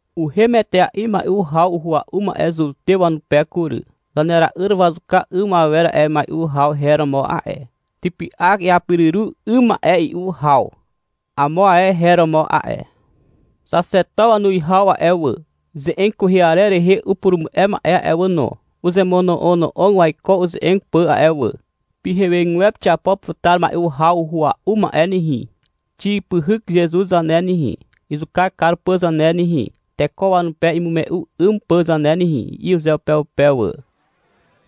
Uhem etea'i mai'u haw uhua'u ma'e Zutew wanupe kury. Zanera'yr wazuka 'ym awer a'e mai'u haw her romo a'e. Typy'ak iapiruru 'ym ma'e i'u haw, amo ae her romo a'e. Xaxeto wanuwihaw a'e wà, ze'eg kwehe arer rehe upurumu'e ma'e a'e wà no, uzemono'ono'og waiko uze'eg pà a'e wà. — Pyhegwepe xiapo putar mai'u haw uhua'u ma'e nehe. Xipyhyk Zezuz zane nehe, izuka kar pà zane nehe, teko wanupe imume'u 'ym pà zane nehe, i'i uzeupeupe wà.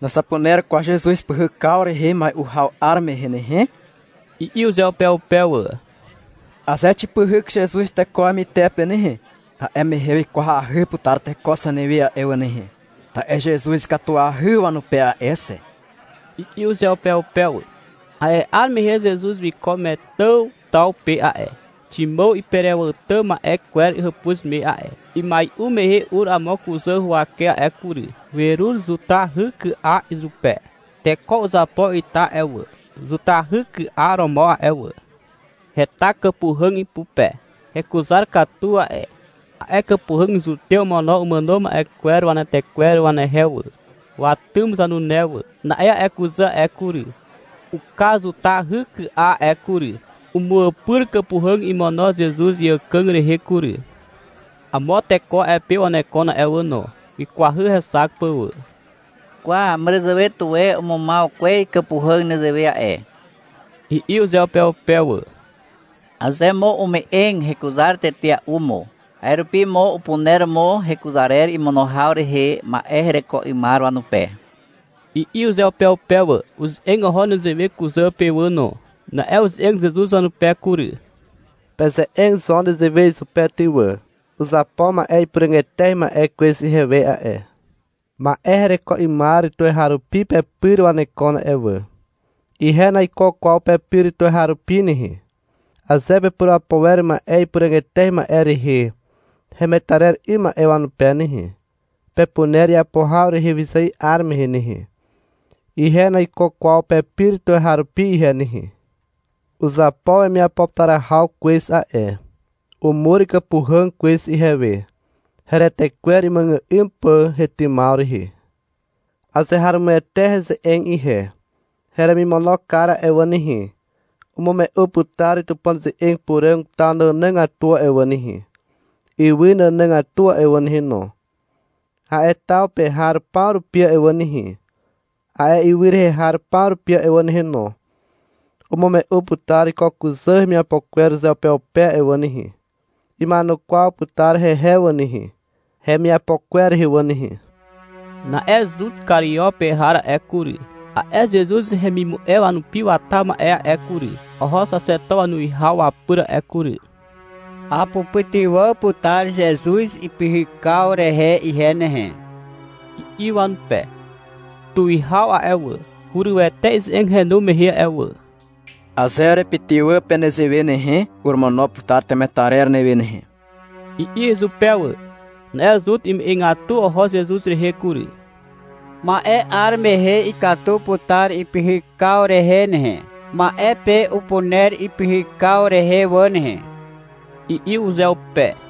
— Nazapuner kwaw Zezuz pyhykaw rehe mai'u haw 'ar mehe nehe, i'i uzeupeupe wà. — Aze xipyhyk Zezuz teko wamytepe nehe, a'e mehe wikwahy putar teko zanewe a'e wà nehe, ta'e Zezuz ikatuahy wanupe a'e xe, i'i uzeupeupe wà. A'e 'ar mehe Zezuz wiko Metàn taw pe a'e, Ximàw iperewàtà ma'e kwer hàpuz me a'e. Imai'u mehe ur amo kuzà huwake a'e kury. Werur zutahyky'a izupe. (Teko uzapo ita a'e wà, zutahyky'a romo a'e wà.) Heta kàpuhàg ipupe. Hekuzar katu a'e. A'e kàpuhàg Zutew omono umàno ma'e kwer wanetekwer wanehe wà, watym zanune wà. Na'e a'e kuzà a'e kury, uka zutahyky'a a'e kury. Umu'àpyr kàpuhàg imono Zezuz iàkàg rehe kury. Amo teko a'e pe wanekon a'e wà no. Wikwahy hexak pà wà. — Kwa, màràzàwe tuwe umumaw kwez kàpuhàg nezewe a'e, i'i uzeupeupe wà. — Aze mo ume'eg, hekuzar tetea'u mo. A'e rupi mo upuner mo hekuzarer imono haw rehe ma'e hereko 'ymar wanupe, i'i uzeupeupe wà. Uze'eg oho nezewe kuzà pe wà no. Na'e uze'eg Zezuz wanupe kury. — Peze'eg zo nezewe izupe ty wà. Uzapo ma'e ipuràg eteahy ma'e kwez ihewe a'e. Ma'e hereko 'ymar tuweharupi pepyr wanekon a'e wà. Ihe naiko kwaw pepyr tuweharupi nehe. Aze pepurapo wer ma'e ipuràg eteahy ma'e rehe hemetarer 'ym ma'e wanupe nehe, pepuner iapo haw rehe wyzài 'ar mehe nehe. Ihe naiko kwaw pepyr tuweharupi ihe nehe. Uzapo wemiapo putar haw kwez a'e. Umur kàpuhàg kwez ihewe, heretekwer imuàgà'ym pà hetymaw rehe. Azeharomoete heze'eg ihe. Heremimono kar a'e wà nehe, umume'u putar Tupàn ze'eg puràg taw nànàgatu a'e wà nehe, ywy nànàgatu a'e wà nehe no. A'e taw pe har paw rupi a'e wà nehe, a'e ywy rehe har paw rupi a'e wà nehe no, umume'u putar ko kuzà hemiapo kwer uzeupeupe a'e wà nehe. Ima'enukwaw putar hehe wà nehe, hemiapo kwer rehe wà nehe. Na'e Zut Kario pe har a'e kury, a'e Zezuz hemimu'e wanupi wata ma'e a'e kury, oho xaxeto wanuwihaw wapyr a'e kury. — Apupytywà putar Zezuz ipyhykaw rehe ihe nehe, i'i wanupe. Tuwihaw a'e wà, hurywete ize'eg henu mehe a'e wà. — Aze urepytywà pe nezewe nehe, oromono putar temetarer newe nehe, i'i izupe wà. Na'e Zut ume'egatu oho Zezuz rehe kury. — Ma'e 'ar mehe ikatu putar ipyhykaw rehe nehe, ma'e pe upuner ipyhykaw rehe wà nehe, i'i uzeupe.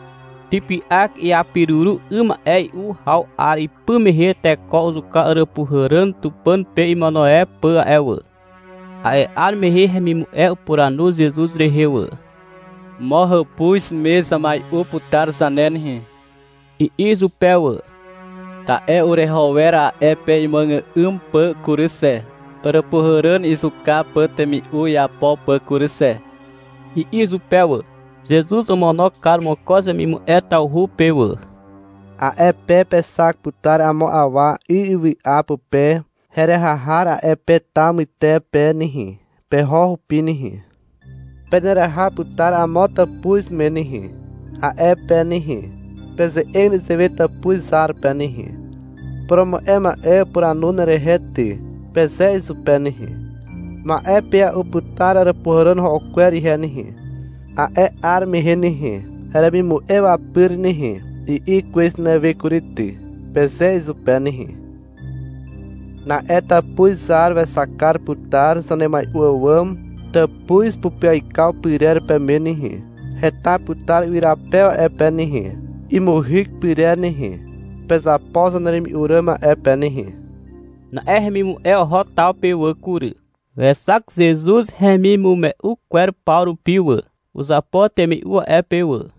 Typy'ak iapiruru 'ym ma'e i'u haw 'ar ipy mehe teko uzuka àràpuhàràn Tupàn pe imono e pà a'e wà. A'e 'ar mehe hemimu'e upuranu Zezuz rehe wà. — Mo hàpuz me zamai'u putar zane nehe, i'i izupe wà. — Ta'e ureho wer a'e pe imuàgà'ym pà kury xe, àràpuhàràn izuka pà temi'u iapo pà kury xe, i'i izupe wà. Zezuz omono kar mokoz wemimu'e tawhu pe wà. A'e pe pexak putar amo awa 'y ywy'a pupe heraha har a'e pe taw mytepe nehe. Peho hupi nehe. Peneraha putar amo tàpuz me nehe. A'e pe nehe, peze'eg nezewe tàpuz zar pe nehe. — Purumu'e ma'e upuranu nerehe ty, peze izupe nehe. — Ma'e pe a'u putar àràpuhàràn ro'o kwer ihe nehe, a'e 'ar mehe nehe, heremimu'e wapyr nehe, i'i kwez newe kury ty, peze izupe nehe. Na'e tàpuz zar wexak kar putar zanemai'u àwàm tàpuz pupyaikaw pyrer peme nehe. Heta putar ywyrapew a'e pe nehe, imuhyk pyrer nehe. Pezapo zaneremi'u ràm a'e pe nehe. Na'e hemimu'e oho taw pe wà kury. Wexak Zezuz hemimume'u kwer paw rupi wà. Uzapo temi'u a'e pe wà.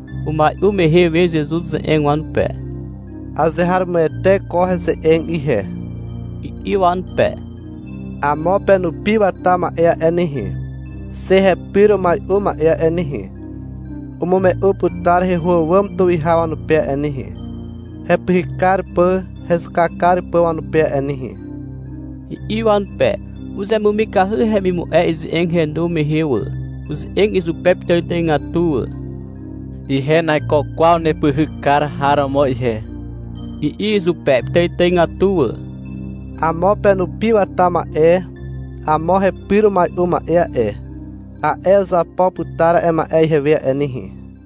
Umai'u mehe we Zezuz uze'eg wanupe. — Azeharomoete ko heze'eg ihe, i'i wanupe. — Amo penupi wata ma'e a'e nehe, xe hepyr umai'u ma'e a'e nehe, umume'u putar heho àwàm tuwihaw wanupe a'e nehe, hepyhyk kar pà hezuka kar pà wanupe a'e nehe, i'i wanupe. Uzemumikahy hemimu'e ize'eg henu mehe wà. Uze'eg izupe pitàitàigatu wà. — Ihe naiko kwaw nepyhyk kar har romo ihe, i'i izupe pitàitàigatu wà. — Amo penupi wata ma'e amo hepyr umai'u ma'e a'e, a'e uzapo putar a'e ma'e ihewe a'e nehe.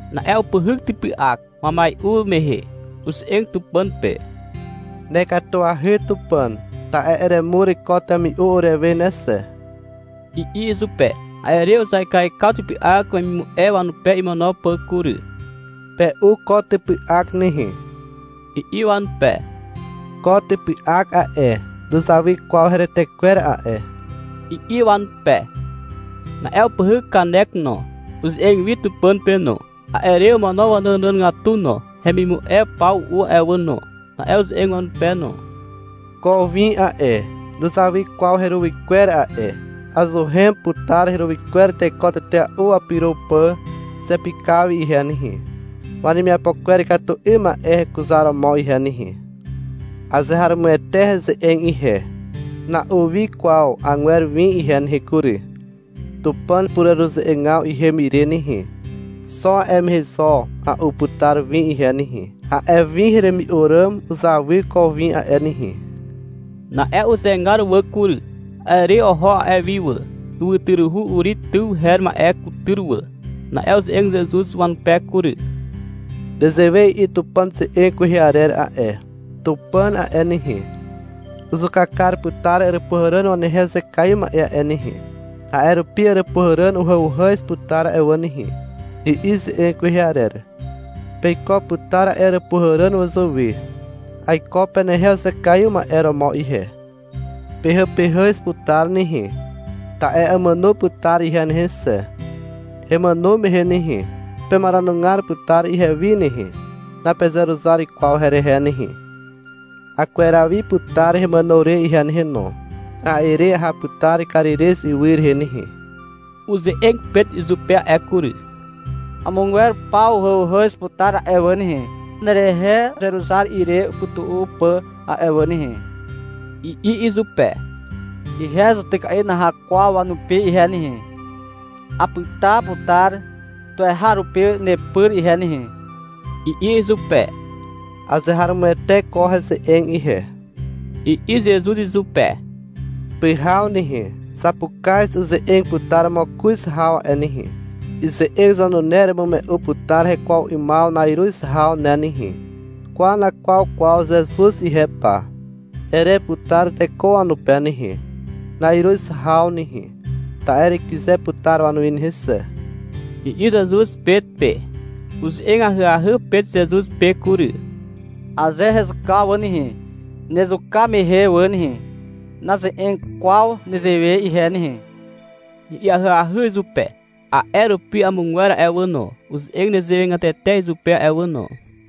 Na'e upyhyk typy'ak, wamai'u mehe. Uze'eg Tupàn pe. — Nekatuahy Tupàn, ta'e eremur ko temi'u urewe ne xe, i'i izupe. A'e re uzaikaikaw typy'ak wemimu'e wanupe imono pà kury. — Pe'u ko typy'ak nehe, i'i wanupe. — Ko typy'ak a'e, nuzawy kwaw heretekwer a'e, i'i wanupe. Na'e upyhyk kanek no. Uze'eg wi Tupàn pe no. A'e re omono wanànàgatu no. Hemimu'e paw u'u a'e wà no. Na'e uze'eg wanupe no. — Ko win a'e, nuzawy kwaw heruwy kwer a'e, azuhen putar heruwy kwer teko tetea'u wapyro pà zepykaw wi ihe nehe, wanemiapo kwer ikatu 'ym ma'e hekuzaromo ihe nehe. Azeharomoete heze'eg ihe, na'u wi kwaw 'agwer win ihe nehe kury. Tupàn pureruze'egaw ihem ire nehe, xo a'e mehe zo a'u putar win ihe nehe. A'e win heremi'u ràm uzawy ko win a'e nehe. Na'e uzegar wà kury. A'e re oho a'e wi wà, ywytyruhu Uri tyw her ma'e kutyr wà. Na'e uze'eg Zezuz wanupe kury. — Nezewe i'i Tupàn ze'eg kwehe arer a'e. Tupàn a'e nehe, uzuka kar putar àràpuhàràn wanehe uzekaiw ma'e a'e nehe. A'e rupi àràpuhàràn uhàuhàz putar a'e wà nehe, i'i ze'eg kwehe arer. Peiko putar a'e àràpuhàràn wazàwe. Aiko penehe uzekaiw ma'e romo ihe. Pehàpehàz putar nehe. Ta'e amàno putar ihe nehe xe. Hemàno mehe nehe, pemaranugar putar ihewi nehe. Napezeruzar kwaw herehe nehe. Akweraw wi putar hemàno re ihe nehe no. A'e re aha putar Karirez ywy rehe nehe. Uze'eg Pet izupe a'e kury. — Amogwer paw uhàuhàz putar a'e wà nehe, nerehe uzeruzar ire upytu'u pà a'e wà nehe, i'i izupe. — Ihe zutyka'i naha kwaw wanupi ihe nehe, apyta putar tuweharupi nepyr ihe nehe, i'i izupe. — Azeharomoete ko heze'eg ihe, i'i Zezuz izupe. — Pyhaw nehe, zapukaz uze'eg putar mokoz haw a'e nehe. Ize'eg zanune eremume'u putar hekwaw 'ymaw na'iruz haw ne nehe. — Kwa, nakwaw kwaw Zezuz ihe pa, ere putar teko wanupe nehe, na'iruz haw nehe, ta'e erekyze putar wanuwi nehe xe, i'i Zezuz Pet pe. Uze'eg ahyahy Pet Zezuz pe kury. — Aze hezuka wà nehe, nezuka mehe wà nehe, naze'eg kwaw nezewe ihe nehe, i'i ahyahy izupe. A'e rupi amogwer a'e wà no, uze'eg nezewegatete izupe a'e wà no.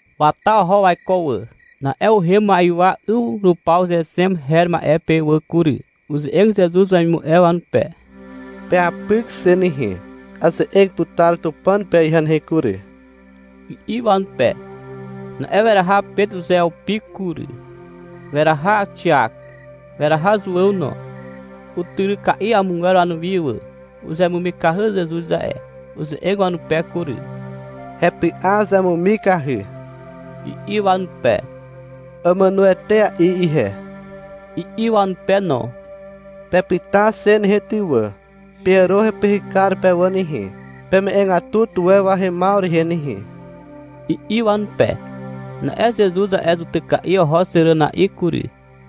Wata oho waiko wà. Na'e uhem ma'ywa 'yw rupaw Zexem her ma'e pe wà kury. Uze'eg Zezuz wemimu'e wanupe. — Peapyk xe nehe. Aze'eg putar Tupàn pe ihe nehe kury, i'i wanupe. Na'e weraha Pet uzeupi kury, weraha Xiak, weraha Zuàw no. Utyryka'i amogwer wanuwi wà. Uzemumikahy Zezuz a'e. Uze'eg wanupe kury. — Hepy'a uzemumikahy, i'i wanupe. — Amàno etea'i ihe, i'i wanupe no. — Pepyta xe nehe ty wà, peàro hepyhykar pe wà nehe, peme'egatu tuwe wahemaw rehe nehe, i'i wanupe. Na'e Zezuz a'e zutyka'i oho xeràna'i kury.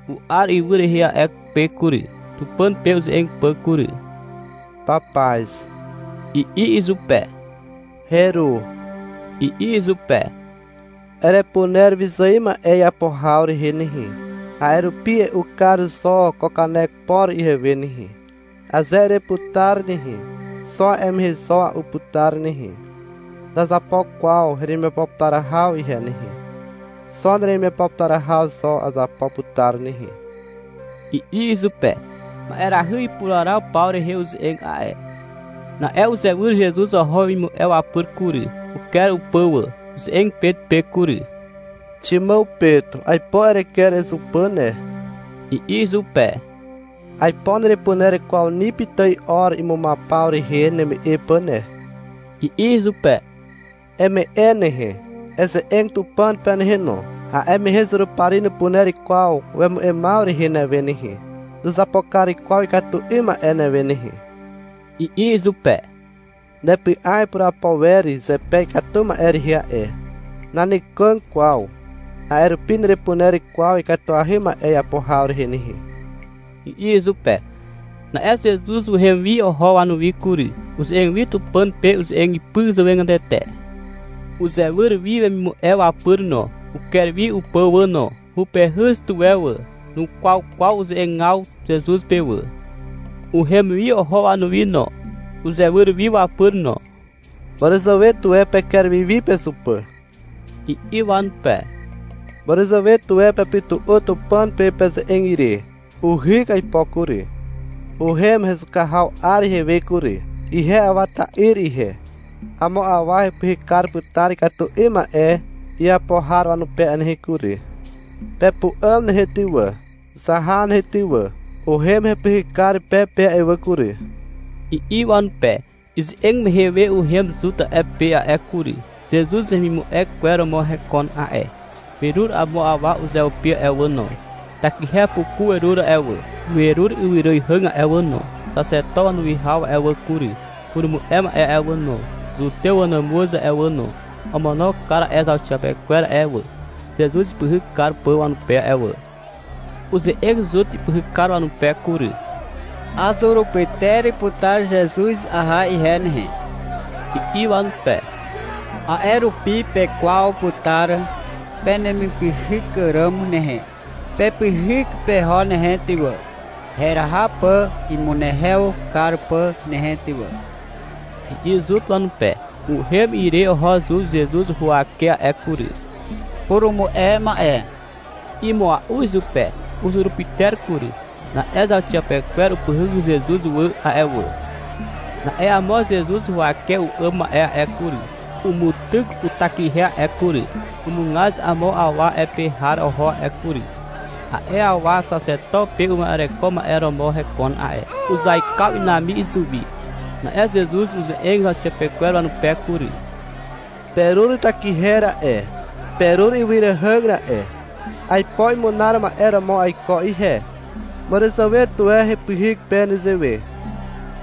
U'ar ywy rehe a'e pe kury, Tupàn pe uze'eg pà kury. — Papaz, i'i izupe. — Heru, i'i izupe. — Erepuner wyzài ma'e iapo haw rehe nehe. A'e rupi e'u kar zo ko kanek por ihewe nehe. Aze ereputar nehe, xo a'e mehe zo a'u putar nehe. Nazapo kwaw heremiapo putar haw ihe nehe. Xo neremiapo putar haw zo azapo putar nehe, i'i izupe. (Ma'erahy ipuraraw paw rehe uze'eg a'e.) Na'e uzewyr Zezuz oho wemimu'e wapyr kury. Uker upà wà. Uze'eg Pet pe kury. — Ximàw Pet, aipo ereker ezupà ne, i'i izupe. — Aipo nerepuner kwaw ni pitài or imumaw paw rehe neme'e pà ne, i'i izupe. — Eme'e nehe, eze'eg Tupàn pe nehe no. A'e mehe Zurupari nupuner kwaw wemu'emaw rehe newe nehe. Nuzapo kar kwaw ikatu 'ym ma'e newe nehe, i'i izupe. — Nepy'a ipurapo wer zepe ikatu ma'e rehe a'e. Nanekàg kwaw. A'e rupi nerepuner kwaw ikatuahy ma'e iapo haw rehe nehe, i'i izupe. Na'e Zezuz uhem wi oho wanuwi kury. Uze'eg wi Tupàn pe uze'eg ipy zàwegatete. Uzewyr wi wemimu'e wapyr no. Uker wi upà wà no. Hupehyz tuwe wà. Nukwaw kwaw uze'egaw Zezuz pe wà. Uhem wi oho wanuwi no. Uzewyr wi wapyr no. — Màràzàwe tuwe peker wi wi pezupà, i'i wanupe. — Màràzàwe tuwe pepytu'u Tupàn pe peze'eg ire. Uhyk aipo kury. Uhem hezuka haw 'ar ihewe kury. Ihe Awa ta'yr ihe. Amo awa hepyhyk kar putar ikatu 'ym ma'e iapo har wanupe a'e nehe kury. Pepu'àm nehe ty wà, zaha nehe ty wà, uhem hepyhykar pe pe a'e wà kury, i'i wanupe. Ize'eg mehe we uhem Zut a'e pe a'e kury. (Zezuz hemimu'e kwer romo hekon a'e.) Werur amo awa uzeupi a'e wà no. Takihe puku werur a'e wà, werur ywyràihàg a'e wà no. Xaxeto wanuwihaw a'e wà kury, purumu'e ma'e a'e wà no, Zutew wanàmuz a'e wà no, omono kar a'e zauxiapekwer a'e wà, Zezuz ipyhyk kar pà wanupe a'e wà. Uze'eg Zut ipyhykar wanupe kury. — Azurupyter putar Zezuz aha ihe nehe, i'i wanupe. — A'e rupi pekwaw putar penemipyhyk ràm nehe. Pepyhyk peho nehe ty wà, heraha pà imunehew kar pà nehe ty wà, i'i Zut wanupe. Uhem ire oho Zut Zezuz huwake a'e kury. — Purumu'e ma'e, i'i mua'u izupe. Uzurupyter kury. Na'e zauxiapekwer upyhyk Zezuz wà a'e wà. Na'e amo Zezuz huwake u'àm ma'e a'e kury, umutyk utakihe a'e kury, umugaz amo awa a'e pe har oho a'e kury. A'e awa xaxeto pe uma'ereko ma'e romo hekon a'e. Uzaikaw inami izuwi. Na'e Zezuz uze'eg zauxiapekwer wanupe kury. — Perur takihe ra'e, perur ywyràihàg ra'e. Aipo imunar ma'e romo aiko ihe. Màràzàwe tuwe hepyhyk pe nezewe.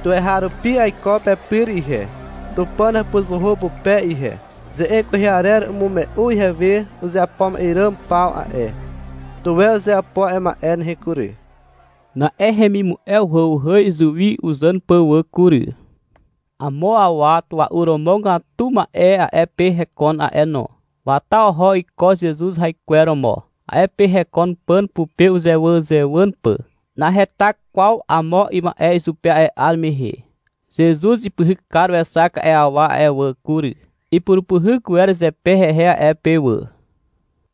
Tuweharupi aiko pepyr ihe, Tupàn hàpuzuhu pupe ihe. Ze'eg kwehe arer umume'u ihewe uzeapo ma'e ràm paw a'e. Tuwe uzeapo a'e ma'e nehe kury. Na'e hemimu'e uhàuhàz izuwi uzàn pà wà kury. Amo awa tua'u romogatu ma'e a'e pe hekon a'e no. Wata oho iko Zezuz haikwer romo. A'e pe hekon pàn pupe uzewàzewàn pà. Naheta kwaw amo ima'e izupe a'e 'ar mehe. Zezuz ipyhykar wexak a'e awa a'e wà kury. Ipurupyhyk wer zepe hehe a'e pe wà.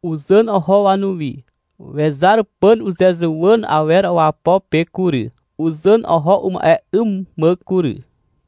Uzàn oho wanuwi. Wezar pàn uzezuwàn awer wapo pe kury. Uzàn oho uma'e 'ym mà kury.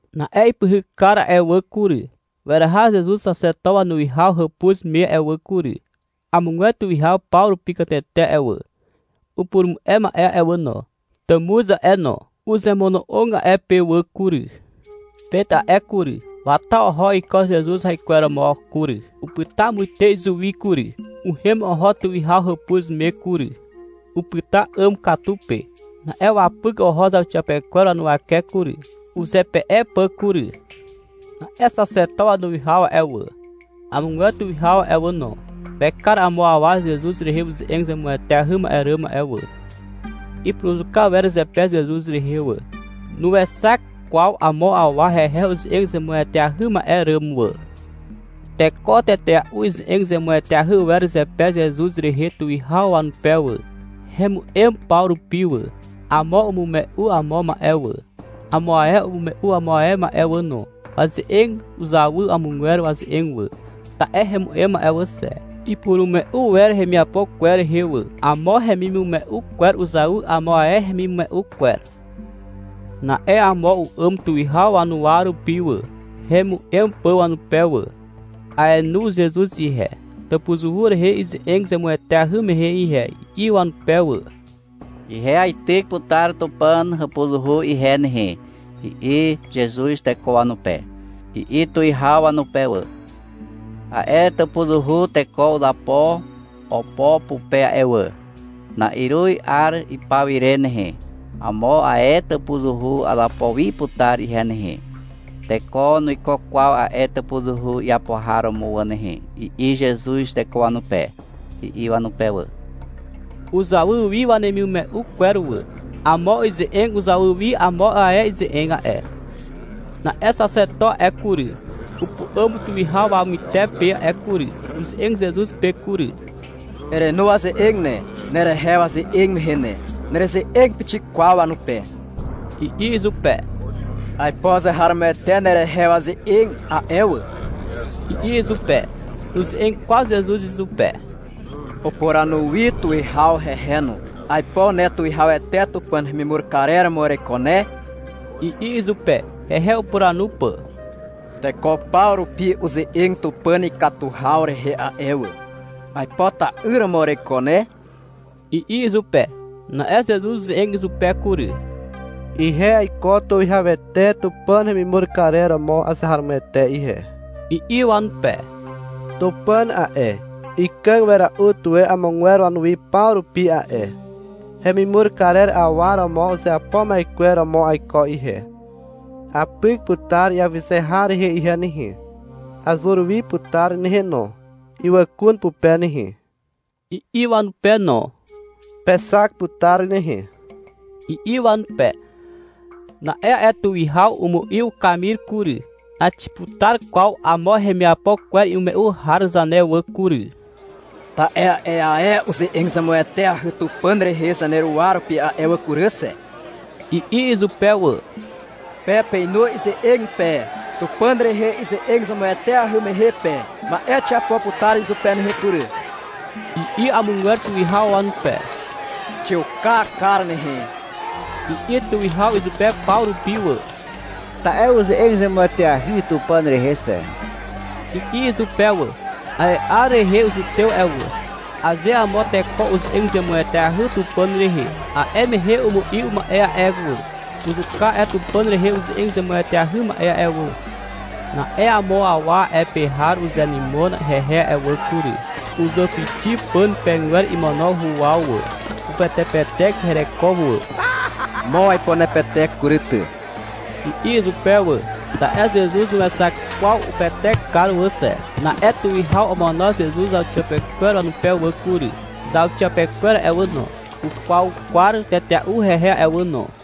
Na'e ipyhykar a'e wà kury, weraha Zezuz xaxeto wanuwihaw hàpuz me a'e wà kury. Amogwer tuwihaw paw rupi katete a'e wà, upurumu'e ma'e a'e wà no, tàmuz a'e no, uzemono'og a'e pe wà kury. Pet a'e kury, wata oho iko Zezuz haikweromo kury. Upyta muite izuwi kury. Uhem oho tuwihaw hàpuz me kury. Upyta 'àm katu pe. Na'e wapyk oho zauxiapekwer wanuwake kury, uzepe'e pà kury. Na'e xaxeto wanuwihaw a'e wà, amogwer tuwihaw a'e wà no, wekar amo awa Zezuz rehe uze'eg zemueteahy ma'e ràm a'e wà. Ipuruzuka wer zepe Zezuz rehe wà. Nuexak kwaw amo awa hehe uze'eg zemueteahy ma'e ràm wà. Teko tetea'u ize'eg zemueteahy wer zepe Zezuz rehe tuwihaw wanupe wà. Hemu'em paw rupi wà. Amo umume'u amo ma'e wà, amo ae umume'u amo ae ma'e wà no. Waze'eg uzawy amogwer waze'eg wà. Ta'e hemu'em a'e wà xe. Ipurumume'u wer hemiapo kwer rehe wà. Amo hemimume'u kwer uzawy amo ae hemimume'u kwer. Na'e amo u'àm tuwihaw wanuwa rupi wà, hemu'em pà wanupe wà. — Aenu Zezuz ihe, tàpuzuhu rehe ize'eg zemueteahy mehe ihe, i'i wanupe wà. — Ihe aityk putar Tupàn hàpuzuhu ihe nehe, i'i Zezuz teko wanupe, i'i tuwihaw wanupe wà. — A'e tàpuzuhu teko uzapo opo pupe a'e wà. Na'iruz 'ar ipaw ire nehe, amo ae tàpuzuhu azapo wi putar ihe nehe. Teko nuiko kwaw a'e tàpuzuhu iapo har romo wà nehe, i'i Zezuz teko wanupe, i'i wanupe wà. Uzawy wi wanemimume'u kwer wà. Amo ize'eg uzawy wi amo ae ize'eg a'e. Na'e xaxeto a'e kury, upu'àm tuwihaw wamytepe a'e kury. Uze'eg Zezuz pe kury. — Erenu waze'eg ne, nerehe waze'eg mehe ne. Nereze'eg pixik kwaw wanupe, i'i izupe. — Aipo azeharomoete nerehe waze'eg a'e wà, i'i izupe. Nuze'eg kwaw Zezuz izupe. Upuranu wi tuwihaw hehe no. — Aipo ne Tuwihawete Tupàn hemimur karer romo ereiko ne, i'i izupe, hehe upuranu pà. — Teko paw rupi uze'eg Tupàn ikatu haw rehe a'e wà. — Aipo ta'yr romo ereiko ne, i'i izupe. Na'e Zezuz uze'eg izupe kury. — Ihe aiko Tuwihawete Tupàn hemimur karer romo azeharomoete ihe, i'i wanupe. — Tupàn a'e, ikàg wera'u tuwe amogwer wanuwi paw rupi a'e. Hemimur karer awa romo uzeapo ma'e kwer romo aiko ihe. Apyk putar iawyze har rehe ihe nehe. Azur wi putar nehe no, ywàkun pupe nehe, i'i wanupe no. — Pexak putar nehe, i'i wanupe. Na'e a'e tuwihaw umu'i ukamir kury. — Naxiputar kwaw amo hemiapo kwer imume'u har zane wà kury. Ta'e a'e ae uze'eg zemueteahy Tupàn rehe zaneruwa rupi a'e kury xe, i'i izupe wà. — Pe peinu ize'eg pe, Tupàn rehe ize'eg zemueteahy mehe pe. Ma'e xiapo putar izupe nehe kury, i'i amogwer tuwihaw wanupe. — Xiuka kar nehe, i'i tuwihaw izupe paw rupi wà. — Ta'e uze'eg zemueteahy Tupàn rehe xe, i'i izupe wà. (A'e 'ar rehe Zutew a'e wà, aze amo teko uze'eg zemueteahy Tupàn rehe, a'e mehe umu'i uma'e a'e wà, uzuka a'e Tupàn rehe uze'eg zemueteahy ma'e a'e wà.) Na'e amo awa a'e pe har uzenymon hehe a'e wà kury. Uzàpixi pàn pegwer imono huwaw wà. Upetepetek hereko wà. — Mo aipo nepetek kury ty, i'i izupe wà. Ta'e Zezuz nuexak kwaw upetekar wà xe. Na'e tuwihaw omono Zezuz zauxiapekwer wanupe wà kury. Zauxiapekwer a'e wà no, ukwaukwar tetea'u hehe a'e wà no.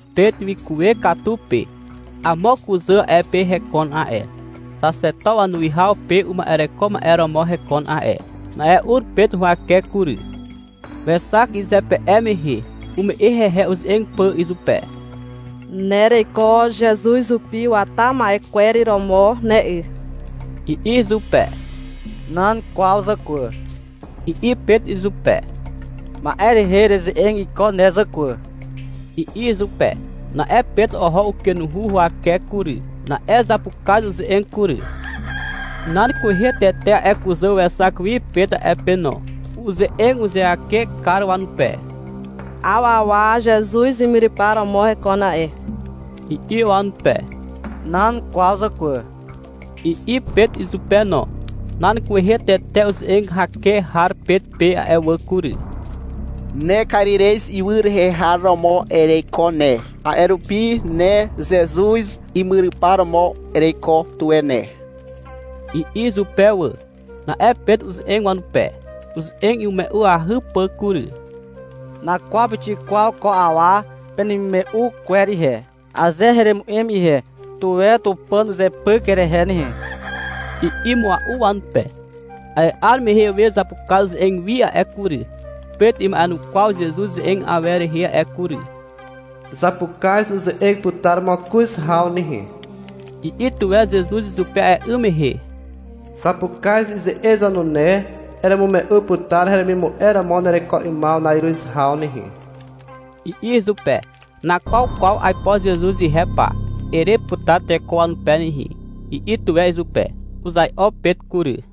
Pet wikuwe katu pe. Amo kuzà a'e pe hekon a'e. Xaxeto wanuwihaw pe uma'ereko ma'e romo hekon a'e. Na'e ur Pet huwake kury. Wexak izepe'e mehe. Ume'e hehe uze'eg pà izupe. — Ne ereiko Zezuz hupi wata ma'e kwer romo ne 'y, i'i izupe. — Nan kwaw zàkwà, i'i Pet izupe. — Ma'e rehe ereze'eg iko ne, zàkwà, i'i izupe. Na'e Pet oho ukenuhu huwake kury. Na'e zapukaz uze'eg kury. Nan kwehe tete a'e kuzà wexak wi Pet a'e pe no. Uze'eg uzeake kar wanupe. — 'Aw awa Zezuz imyrypar romo hekon a'e, i'i wanupe. — Nan kwaw zàkwà, i'i Pet izupe no. Nan kwehe tete uze'eg hake har Pet pe a'e wà kury. — Ne Karirez ywy rehe har romo ereiko ne, a'e rupi ne Zezuz imyrypar romo ereiko tuwe ne, i'i izupe wà. Na'e Pet uze'eg wanupe, uze'eg imume'uahy pà kury. — Nakwaw pixik kwaw ko awa penemimume'u kwer ihe. Aze heremu'em ihe, tuwe Tupàn uzepyk herehe nehe, i'i mua'u wanupe. A'e 'ar mehe we zapukaz uze'eg wi a'e kury. Pet ima'enukwaw Zezuz ze'eg awer rehe a'e kury. — Zapukaz uze'eg putar mokoz haw nehe, i'i tuwe Zezuz izupe a'e 'ym mehe. — Zapukaz ize'eg zanune eremume'u putar heremimu'e romo nereko 'ymaw na'iruz haw nehe, i'i izupe. — Nakwaw kwaw aipo Zezuz ihe pa, ere putar teko wanupe nehe, i'i tuwe izupe. Uzai'o Pet kury.